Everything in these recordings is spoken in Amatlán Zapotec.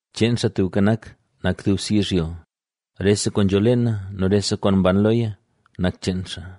Cheen Xaa Tubka Nak nak dubse yizhyo, rese kwaan nzho leena nu rese kwaan mban loya nak cheen xaa.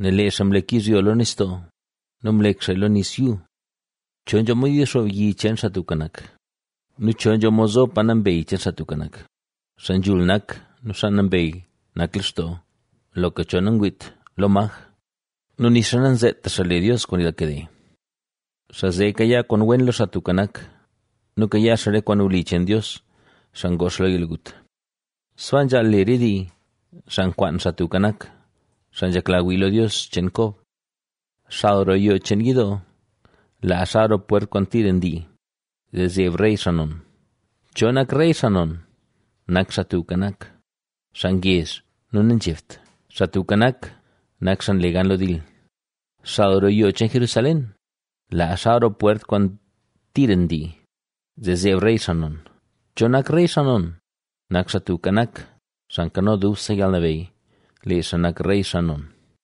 Nel lee xaa mlek yizhyo lo nistoo nu mlek xaaya lo nis yuu. ¿Cho nzho mod yixoob yi cheen Xaa Tubka Nak? ¿Nu cho nzho mod zo pa nambey cheen Xaa Tubka Nak? Xaa nzhul nak nu xaa nambey nak lextoo, loka cho nangwiit lo maj nu nixa nanzeeta xaa le Dios kwaan yalkade. Xaa zee kayaa kwaan wen lo Xaa Tubka Nak nu kayaa xaa re kwaan wli cheen Dios, xaa ngoo xaa lo yalgut. Sbaa nzhaal le re dii, xaa nkwaan Xaa Tubka Nak, xaa nzhekla wii lo Dios cheen Kob. Xal roo yoo cheen yidoo. ¡Laa xal roo pwert kwaan tira ndii, zee zeeb rey xaa non! ¿Cho nak rey xaa non? ¡Nak Xaa Tubka Nak, xaa ngezh nu nanzhebt! ¡Xaa Tubka Nak, nak xaa nle gan lo dil! ¡Xal roo yoo cheen Jerusalén! ¡Laa xal roo pwert kwaan tira ndii, zee zeeb Rey, xaa non! ¿Cho nak rey xaa non? ¡Nak Xaa Tubka Nak, Xaa Nkano Dubse Yalnabeyy! ¡Lee xaa nak Rey xaa non!